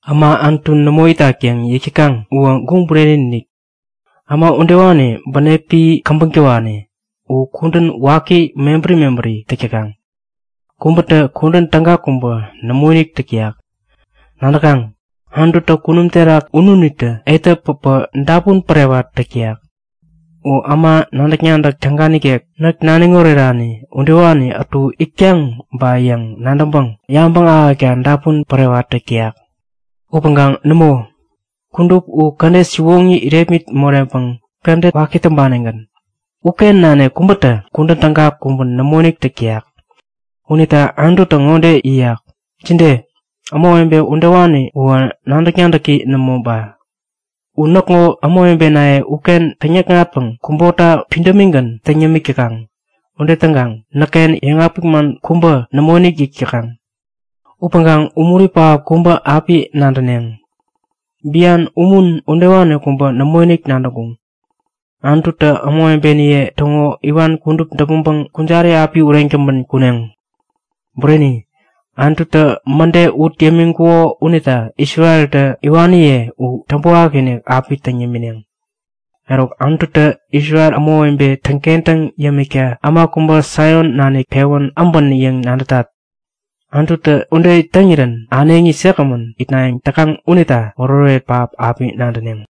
Äma Anutu nämo itak yäŋ yäk täkaŋ uwä guŋ bureni-inik! Äma udewani bänepi käbäŋ täwani. U kudän waki mebäri mebäri täk täkaŋ. Kubätä kudän täga kubä nämoinik täk täyak. Nadäkaŋ? Anututä kunum terak ununitä etä päpä dapun pärewat täk täyak. U äma nadäk-nadäk täga nikek näk naniŋ orerani udewani ätu itkaŋ ba yäŋ nadäŋpäŋ yabäŋ ahäkta dapun pärewat täk täyak. Upäŋkaŋ nämo, kudup u kädet siwoŋi irepmit moreŋpäŋ kädet waki täŋpanigän. Uken nanik kubätä kudän täga kubä nämoinik täk täyak. Unita Anututä ŋode yäyak; Jide? Ämawebe udewani uwä nadäk-nadäki nämo ba? U näkŋo ämawebenaye uken täŋyäkŋatpäŋ kubota pidämigän täŋ yämik täkaŋ. Ude täŋkaŋ näkken yäŋapik man kubä nämoinik yäk täkaŋ. Upäŋkaŋ umuri pähap kubä api nadäneŋ. Bian umun udewani kubä nämoinik nadäŋkuŋ. Anututä ämawebeniye täŋo iwan kudup däpmäŋpäŋ kujari api ureŋ täŋpän kuneŋ. Bureni, Anututä mäde ut yämiŋkuko unita Isreltä iwaniye u täŋpäwakinik api täŋ yämineŋ. Eruk, Anututä Isrel ämawebe täŋkentäŋ yämikta äma kubä Saion nanik pewän äbän yäŋ nadätat. Anututä ude täŋirän äneŋi säkgämän itnayäŋ täkaŋ unita oretoret pähap api nadäneŋ!